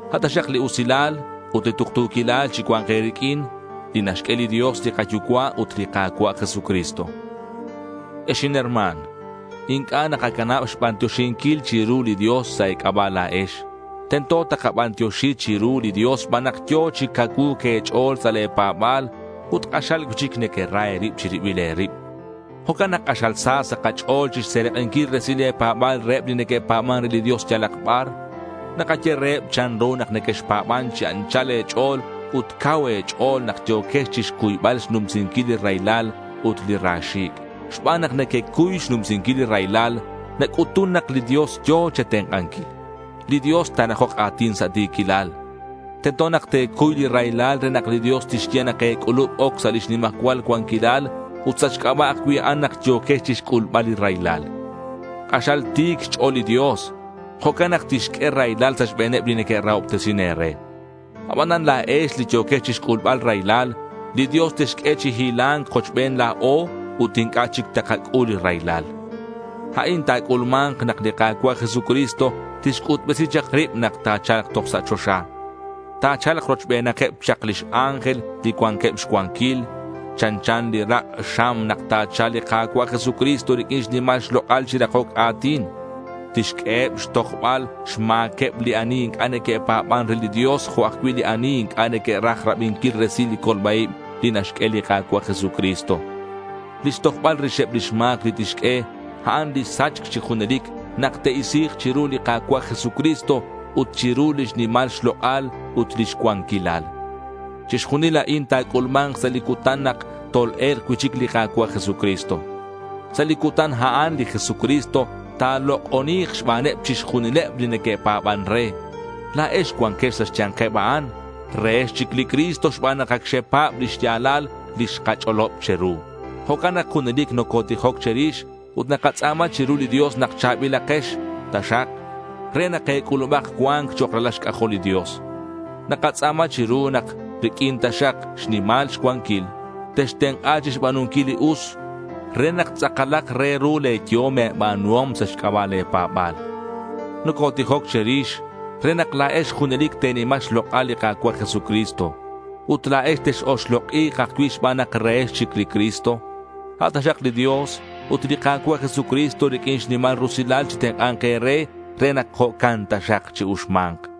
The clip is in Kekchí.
A' taxak li usilal ut li tuktu̱quilal chicua̱nk e̱riq'uin, li naxq'ue li Dios li kaYucua' ut li Ka̱cua' Jesucristo. Ex inherma̱n, inc'a' nakacanab xbantioxinquil chiru li Dios sa' e̱c'aba' la̱ex. Tento takabantioxi chiru li Dios xban nak yo̱ chi cacuu̱c e̱ch'o̱l sa' le̱ pa̱ba̱l ut k'axal cui'chic nequera e̱rib che̱ribil e̱rib. Jo'can nak k'axal sa sa' kach'o̱l chixserak'inquil resil le̱ pa̱ba̱l reheb li neque'pa̱ban re li Dios yalak bar. Nakaye reheb chanru nak nequexpa̱ban chi anchal e̱ch'o̱l ut cau e̱ch'o̱l nak yo̱quex chixcuybal xnumsinquil li raylal ut li ra xi̱c'. Xban nak nequecuy xnumsinquil li raylal nac'utun nak li Dios yo̱ che̱tenk'anquil. Li Dios ta̱rakok a̱tin sa' ti̱quilal. Tento nak te̱cuy li raylal re nak li Dios tixye nak e̱c'ulub oc sa' lix nimajcual cuanquilal ut sa' xc'aba' ajcui' a'an nak yo̱quex chixc'ulbal li raylal. K'axal ti̱c xch'o̱l li Dios. Jo'can nak tixq'ue raylal sa' xbe̱neb li neque'rahobtesin e̱re. Abanan la̱ex li yo̱quex chixc'ulbal raylal, li Dios texq'ue chi hila̱nc kochben la̱o ut inc'a' chic takac'ul raylal. A'in ta̱c'ulma̱nk nak li Ka̱cua' Jesucristo tixc'utbesi chak rib nak ta̱cha̱lk toj sa' choxa. Ta̱cha̱lk rochbenakeb chak lix ángel li cuanqueb xcuanquil. Chanchan li rak' xam nak ta̱cha̱lk li Ka̱cua' Jesucristo riq'uin xnimal xlok'al chi rakoc a̱tin. Tixq'ueheb chixtojbal xma̱queb li ani inc'a' neque'pa̱ban re li Dios jo' ajcui' li ani inc'a' neque'raj rabinquil resilal li colba-ib li naxq'ue li Ka̱cua' Jesucristo. Lix tojbal rixeb lix ma̱c li tixq'ue, a'an li sachc chi junelic nak te'isi̱k chiru li Ka̱cua' Jesucristo ut chiru lix nimal xlok'al ut lix cuanquilal. Chixjunil a'in ta̱c'ulma̱nk sa' li cutan nak tol-e̱lk cui'chic li Ka̱cua' Jesucristo. Sa' li cutan a'an li Jesucristo ta̱lok'oni̱k xbaneb chixjunileb li neque'pa̱ban re. La̱ex cuanquex sa' xya̱nkeb a'an. Rehex chic li Cristo xban nak ac xepa̱b li xya̱lal li xkach'olob che̱ru. Jo'can nak junelic nocotijoc che̱rix ut nakatz'a̱ma chiru li Dios nak cha̱bilakex taxak re nak e̱c'ulubak cua̱nc chok' ralal xc'ajol li Dios. Nakatz'a̱ma chiru nak riq'uin taxak xnimal xcuanquil, textenk'a chixba̱nunquil li us re nak tz'akalak re ru le̱ yehom e̱ba̱nuhom sa' xc'aba' le̱ pa̱ba̱l. Nocotijoc che̱rix re nak la̱ex junelic te̱nima xlok'al li Ka̱cua' Jesucristo. Ut la̱ex tex-oxlok'i̱k ajcui' xban nak rehex chic li Cristo. A' taxak li Dios ut li Ka̱cua' Jesucristo riq'uin xnimal rusilal chitenk'a̱nk e̱re re nak jo'can taxak chi-uxma̱nk.